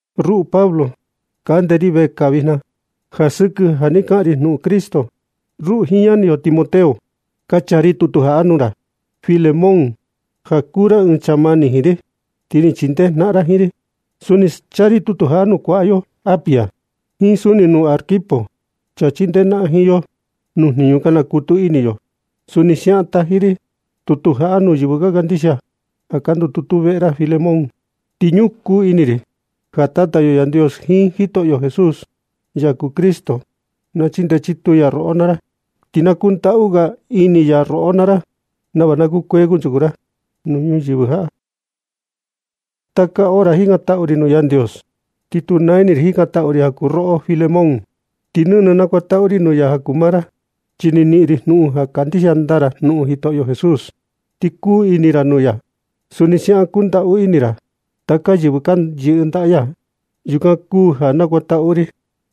Ruꞌu Pablo, kande ri vekaa vijna ja sɨkɨ ja ni kaꞌan ri jnuꞌun Cristo Jesús. Ruꞌu jiin ñani yo Timoteo, ka chaa ri tutu jaꞌa nuu ra, Filemón. Ja kuu ra ɨɨn chaa mani jiin ri, ti ni chindee jnaꞌan ra jiin ri. Suni chaa ri tutu jaꞌa nuu kuaꞌa yo Apia, jiin suni nuu Arquipo, chaa chindee jnaꞌan jiin yo nuu jniñu ka nakutu ini yo. Suni siaꞌan taji ri tutu jaꞌa nuu yɨvɨ ka kandixia ja ka ndututu veꞌe ra, Filemón. Ti ñukuu ini ri ja Tata yo Yandios jiin Jitoꞌo Jesús, ya kuu Cristo, na chindee chituu ya roꞌo naa ra, ti na kundaꞌu ga ini ya roꞌo naa ra, nava na kukuee kunchuku ra nuu ñuyɨvɨ jaꞌa. Taka hora jikantaꞌu ri nuu Yandios, ti tu naa ini ri jikantaꞌu ri ja kuu roꞌo Filemón, ti nɨnɨ nakuantaꞌu ri nuu ya ja kuu maa ra. Chi ni niꞌin ri jnuꞌun ja kandixia ndaa ra Jitoꞌo Jesús, ti kuu ini ra nuu ya. Suni siaꞌan kundaꞌu ini ra taka yɨvɨ ka yɨꞌɨ ndaꞌa ya. Yukan kuu ja nakuantaꞌu ri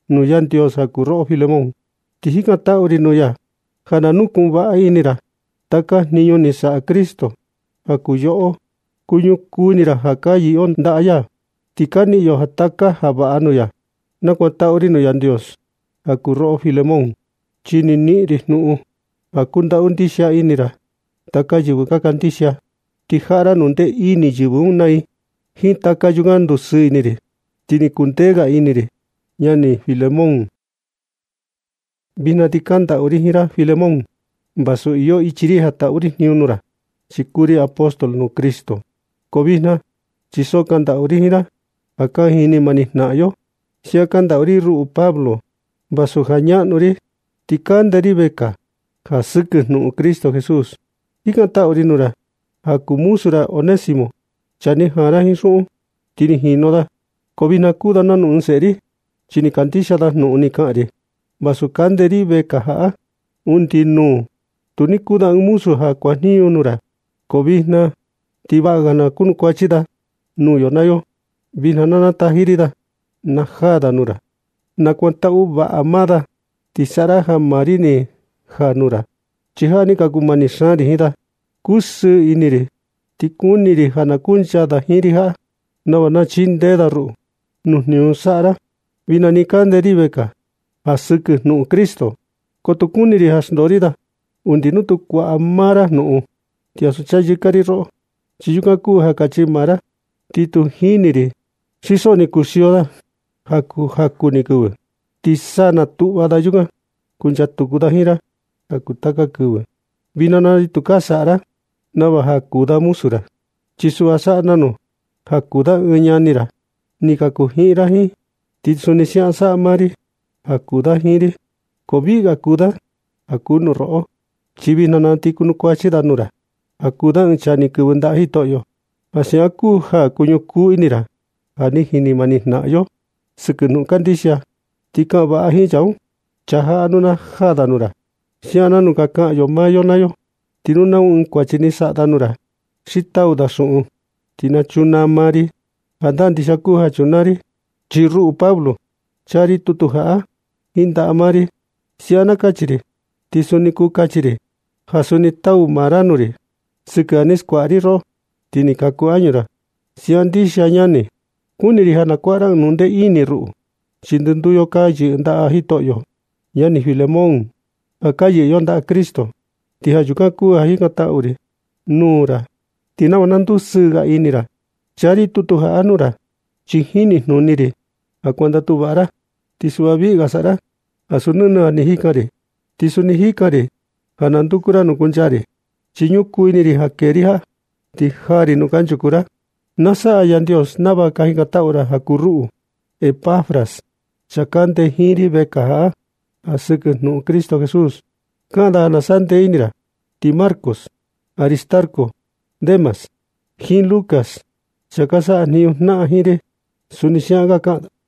nuu Yandios ja kuu roꞌo, Filemón. Ti jikantaꞌu ri nuu ya ja na nukuꞌun vaꞌa ini ra taka jniñu ñaꞌnu ni saꞌa Cristo ja kuu yoꞌo. Kuñukuu ini ra ja ka yɨꞌɨ yo ndaꞌa ya, ti ka niꞌin yo taka ja vaꞌa nuu ya. Nakuantaꞌu ri nuu Yandios ja kuu roꞌo Filemón, chi ni niꞌin ri jnuꞌun ja kundaꞌu ndixia ini ra taka yɨvɨ ka kandixia, ti jaꞌa ra jnundee ini yɨvɨ un naa i. Jiin taka yukan ni ndusɨɨ ini ri, ti ni kuu ndee ga ini ri, ñani Filemón. Vijna ti kandaꞌu ri jiin ra Filemón, vasu iyo ichi ri ja taꞌu ri jniñu nuu ra, chi kuu ri apóstol nuu Cristo. Ko vijna, chi so kandaꞌu ri jiin ra ja ka jini mani jnaꞌan yo. Siaꞌan kandaꞌu ri ruꞌu Pablo. Vasu ja ñaꞌnu ri, ti kande ri vekaa ja sɨkɨ jnuꞌun Cristo Jesús. Jikantaꞌu ri nuu ra ja kuu muzu ra Onésimo, chaa ni jaan ra jiin xuꞌun, ti ni jinu da. Ko vijna ti kuu da nanu ɨɨn seꞌe ri, chi ni kandixia da jnuꞌun ni kaꞌan ri vasu kande ri vekaa jaꞌa. Undi nuu, tu ni kuu da ɨɨn muzu ja kuajniñu nuu ra, ko vijna na ti vaꞌa ga kunukuachi da nuu yo naa yo. Vijna na ti na nataji ri da na najaa da nuu ra. Nakuantaꞌu vaꞌa maa da, ti saꞌa ra ja maa ri ni jaa nuu ra, chi jaꞌa ni ka kuu mani xaan ri jiin da. Kusɨɨ ini ri ti kuni ri ja na kuncha da jiin ri jaꞌa, nava na chindee da ruꞌu nuu jniñu saꞌa ra vijna nɨ kande ri vekaa ja sɨkɨ jnuꞌun Cristo. Ko tu kuni ri ja xndoo ri da undi nuu tu kuaꞌa maa ra jnuꞌun. Ti ansu chayɨka ri roꞌo, chi yukan kuu ja kachi maa ra. Ti tu jini ri xi so ni kuxio da ja kuu jaku ni kɨvɨ, ti sa natuꞌva da yukan kuncha kutu da jiin ra ja kuu taka kɨvɨ. Vijna na ti tukaa saꞌa ra nava ja kuu da muzu ra, chi suꞌva saꞌa nanu ja kuu da ɨɨn ñani ra ni kaku jiꞌin ra jiin. Ti suni siaꞌan saꞌa maa ri ja kuu da jiin ri. Ko viꞌi ga kuu da ja kuu nuu roꞌo, chi vijna na ti kunukuachi da nuu ra ja kuu da ɨɨn chaa ni kɨvɨ ndaꞌa Jitoꞌo. Ja siaꞌan kuu ja nu ñukuu ini ra ja ka jini mani jnaꞌan yo sɨkɨ jnuꞌun kandixia, ti kaꞌan vaꞌa jiin chaa jaꞌa nu na jaa da nuu ra, siaꞌan nanu ka kaꞌan maa yo naa yo. Ti nu nau ɨɨn kuachi ni saꞌa da nuu ra, xi tau da xuꞌun, ti na chunaa maa ri. Jandaa ndixia kuu ja chunaa ri, chi ruꞌu Pablo, chaa ri tutu jaꞌa jiin ndaꞌa maa ri. Siaꞌan na kachi ri, ti suni kuu kachi ri ja suni tau maa ra nuu ri sɨkɨ ja ni skuaꞌa ri roꞌo, ti ni kaku añu ra. Siaꞌan ndixia ñani, kuni ri ja na kuaꞌa ra ɨɨn jnundee ini ruꞌu, chi ndɨnduu yo ka yɨꞌɨ ndaꞌa Jitoꞌo. Ñani Filemón, ja ka yɨꞌɨ yo ndaꞌa Cristo, ti ja yukan kuu ja jikantaꞌu ri nuu ra ti nava na ndusɨɨ ga ini ri. Chaa ri tutu jaꞌa nuu ra, chi jinijnuni ri ja kuandatu vaꞌa ra, ti suꞌva viꞌi ga saꞌa ra ansu nɨnɨ ja ni jikan ri. Ti suni jikan ri ja na nduku ra nuu kuncha ri, chi ñukuu ini ri ja kee ri jaꞌa ti jaa ri nuu kanchuku ra, na saꞌa Yandios nava ka jikantaꞌu ra ja kuu ruꞌu. Epafras, chaa kande jiin ri vekaa jaꞌa ja sɨkɨ jnuꞌun Cristo Jesús, kaꞌan da ja na sandee ini ra. Ti Marcos, Aristarco, Demas, jiin Lucas, chaa ka sajniñu jnaꞌan jiin ri, suni siaꞌan ka kaꞌan da.